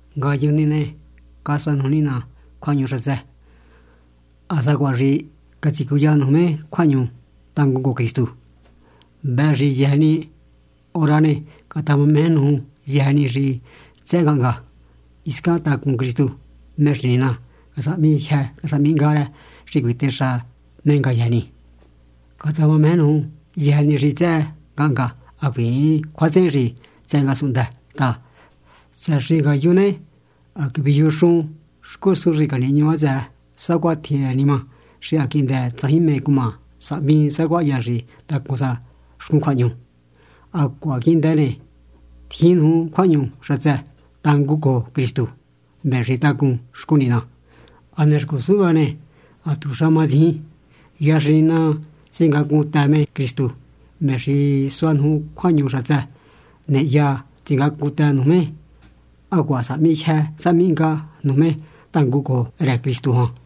Ngayujun ni ne, casua nuju Nina cjuahñu xatsë, ha sacuaha xi catsicuya nuju me cjuahñu tangun cojo Cristu. Vëhë xi yëjë ni hora ne, catamameje nuju yëjë ni xi tsëhë ngahnga, hiscan tacun Cristu, me xi Nina casahmi jyë casahmi hnga rë xi cuitexa me ngayëjë ni. Catamameje nuju yëjë ni xi tsëhë ngahnga, hacuiin cjuatsehen xi tsëhë ngasunhndë ta, tsëhë xi ngayun ne, ha caviyujunxun xcusun xi canihñu hatsëë, sacuatjin rë nima xi ha quihndë tsajin mé cuma sahmi sacuaha hya xi tacun sa xcun cjuahñu. Hacuaha quihndë ne, tjin nuju cjuahñu xatsë tangun cojo Cristu, me xi tacun xcun Nina. Hane xcusun vëhë ne, hatuxa matsijin. Hya xi Nina tsingacuntë me Cristu, me xi sua nuju cjuahñu xatsë ne, hya tsingacuntë nuju me hacuaha sahmi jyë sahmi hnga nuju me tangun cojo rë Cristu jan.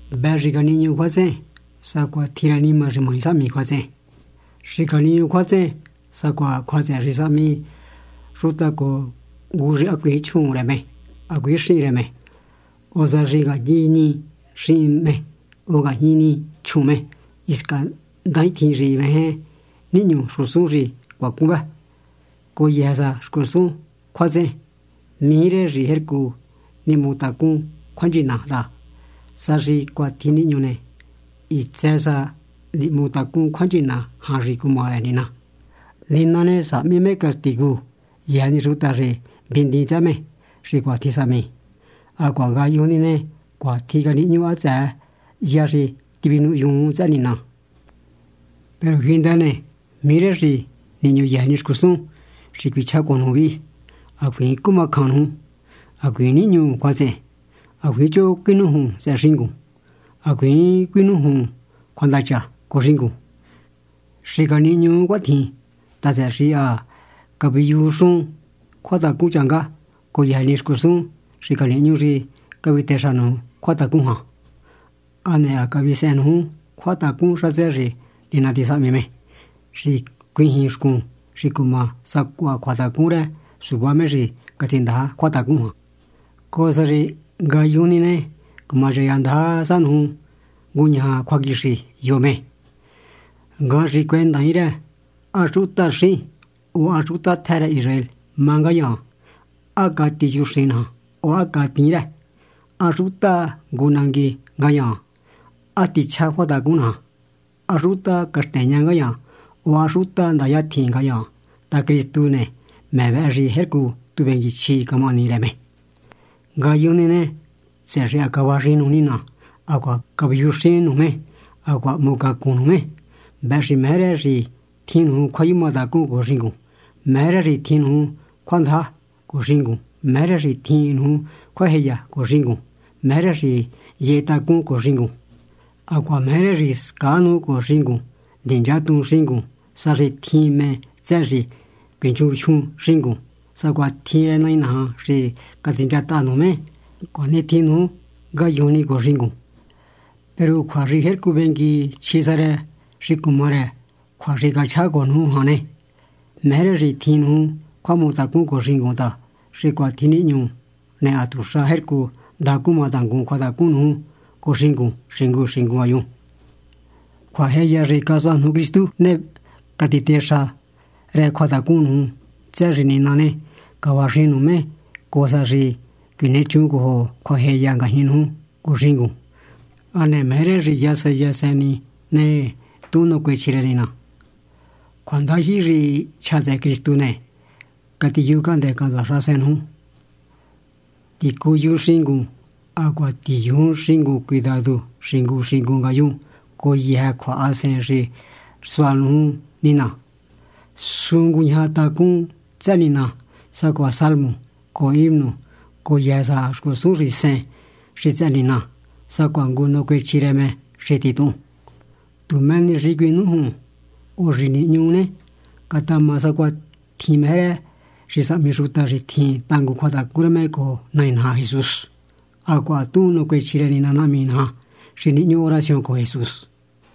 Vëhë xi xicanihñuu cjuatsehen, sacuatjin rë nima xi maji sahmi cjuatsehen. Xicanihñuu cjuatsehen sacuaha cjuatsehen xi sahmi xuta cojo ngu xi hacuiin chjuun rë me, hacuiin xihin rë me, o sa xi ngajñi ni xihin me, o ngajñi ni chjuun me. Hisca ndajin tjin xi meje nihñu xcusun xi cuacun vë, cojo yëjë sa xcusun cjuatsehen. Mijí rë xi jercu nihmu tacún cjuanchina ta, sa xi cuatjin nihñu ne, hitsë sa nihmu tacún cjuanchina jan xi cuma rë Nina. Nina ne, sahmi me castigu yëjë ni xuta xi vihndiin tsëhë me, xi cuatjin sahmi. Hacuaha ngayujun ni ne, cuatjin canihñu hatsëë, hya xi tivinuhyuun tsëhë Nina. Peru quihndë ne, mijí rë xi nihñu yëjë ni xcusun xi cuichjá cojo nuju vihi: hacuiin cumacjan nuju, hacuiin nihñu cjuatsehen, hacuiin choho cuinújun tsëhë xingun, hacuiin cuinújun cjuandacha cojo xingun. Xicanihñuu cuatjin ta, tsëhë xi ha caviyujunxun cjuatacun changá cojo yëjë ni xcusun xi canihñu xi cavitexa nuju cjuatacun jan, hane ha cavisehen nuju cjuatacun xatsë xi Nina tisahmi me xi cuijin xcun xi cuma sacuaha cjuatacun rë suvá me xi catsindaja cjuatacun jan, cojo sa xi ngayujun ni ne, cumachaya ndaja sa nuju nguñaja cjuaquixi yo me. Ngajan xi cuendaain rë ¿há xutaxín o há xuta tjë rë Israel má ngayaan?, ¿há cati chuxin naja o há catiin rë?, ¿há xuta ngu nangui ngayaan?, ¿há tichjá cjuatacun naja?, ¿há xuta caxteña ngayaan, o há xuta ndaya tjin ngayaan? ta Cristu ni ne, me vëhë xi jercu tu vengui chjí camahani rë me. Ngayujun ni ne, tsëhë xi cavaxijin nuju Nina, hacuaha caviyujuxin nuju me, hacuaha hmu cacun nuju me ne, vëhë xi meje rë xi tjin nuju cjuayumatacun cojo xingun, meje rë xi tjin nuju cjuandaja cojo xingun, meje rë xi tjin nuju cjuajeya cojo xingun, meje rë xi yehe tacún cojo xingun. Hacuaha meje rë xi scaa nuju cojo xingun hacuaha ninchatuhun xingun, sa xi tjin mé tsëhë xi cuinchunjyun xingun. Sacuatjin rë Nai naja xi catsinchataha nuju me ne, cuanitjin ni nuju ngayujun ni cojo xingun. Peru xi jercu vengui chjí sa rë xi cuma rë yëjë ni cjua xi cachjá cojo nuju jan ne, meje rë xi tjin nuju cjuahmutacun cojo xingun ta, xi cuatjin nihñu ne, hatuxa jercu ndaja cuma tangun cjuatacun nuju cojo xingun xingu xingu ngayun. Cjuajeya xi casua nuju Cristu ne, catitexa rë cjuatacun nuju ta, tsëhë xi Nina ne, cavaxijin nuju me cojo sa xi cuinechun cojo cjuajeya ngajñi nuju cojo xingun. Hane meje rë xi yasen yasen ni ne, tuhun nacuechji rë Nina. Cjuandajyihi xi chja tsëhë Cristu ne, catiyujucahndë́ cahntsua xahasen nuju. Ticuyun xingun hacuaha tiyujun xingun cuidadu xingu xingu ngayun cojo yëjë cjuahasen xi sua nuju Nina. Sún nguñaja tacún tsëhë Nina, sacuaha salmo cojo himno cojo yëjë sa xcusun xi sen xi tsëhë Nina, sacuaha ngu nacuechji rë me xi tuhun. Tu mé ni xi cuinújun o xi nihñu ne, catama sacuatjin meje rë xi sahmi xuta xi tjin tangun cjuatacun rë me cojo Nai naja Jesús. Hacuaha tuhun nacuechji rë Nina Nahmi naja, xi nihñu oración cojo Jesús.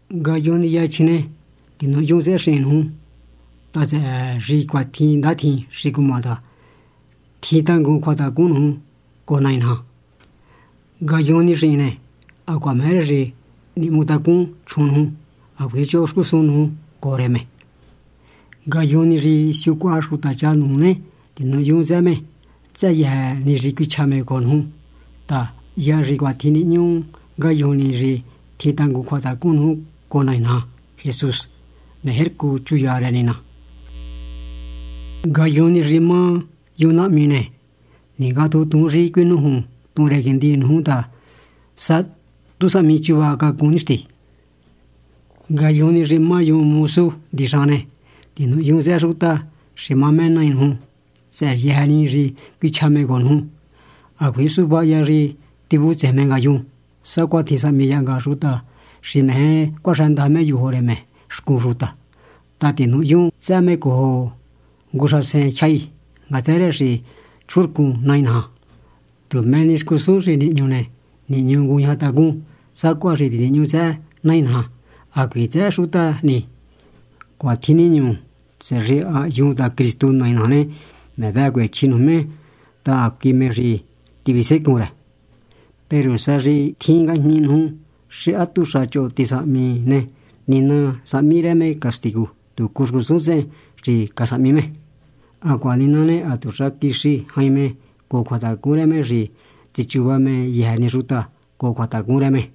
Ngayujun ni yachjin ne, tinuhyun tsëhë xihin nuju ta, tsëhë xi cuatjin ndatjin xi cuma ta, tjin tangun cjuatacun nuju cojo Nai naja. Ngayujun ni xihin ne, hacuaha meje rë xi nihmu tacún chjuun nuju, hacuiin choho xcusun nuju cojo rë me. Ngayujun ni xi siucuaha xutacha nuju ne, tinuhyun tsëhë me tsëhë yëjë ni xi cuichja me cojo nuju ta, hya xi cuatjin nihñu ngayujun ni xi tjin tangun cjuatacun nuju cojo Nai naja Jesús ne, jercu chuya rë Nina. Ngayujun ni xi má yun nahmi ne, xicaningatjuntuun xi cuinújuntuhun rë quihndi nuju, ta sá tu sahmi chúvacacun. Ngayujun ni xi má yun mosu hndixahan ne, tinuhyun tsëhë xuta xi má me nai nuju tsëhë yëjë ni xi cuichja me cojo nuju, hacuiin suvá hya xi tivutsejen me ngayun, sacuatjin sahmi yahnga xuta xi meje cuaxëndaja suvá me yojo rë me xcun xuta, ta tinuhyun tsëhë me cojo ngu xahasen tyjahi ngatsë rë xi chjuhunrcun Nai naja. Tu mé ni xcusun xi nihñu ne, nihñu nguñaja tacún, sacuaha xi tinihñu tsëhë Nai naja, hacuiin tsëhë xuta ni. Cuatjin nihñu, tsëhë xi ha hyun ta Cristu Nai naja ne, me vëhë cuechji nuju me ta hacui me xi tivisecun rë. Peru sa xi tjin ngajñi nuju xi hatuxa choho tisahmi ne, Nina sahmi rë me castigu tucu xcusun tsehen xi casahmi me, hacuaha Nina ne, hatuxa quixi jain me cojo cjuatacun rë me xi tsichuva me yëjë ni xuta cojo cjuatacun rë me.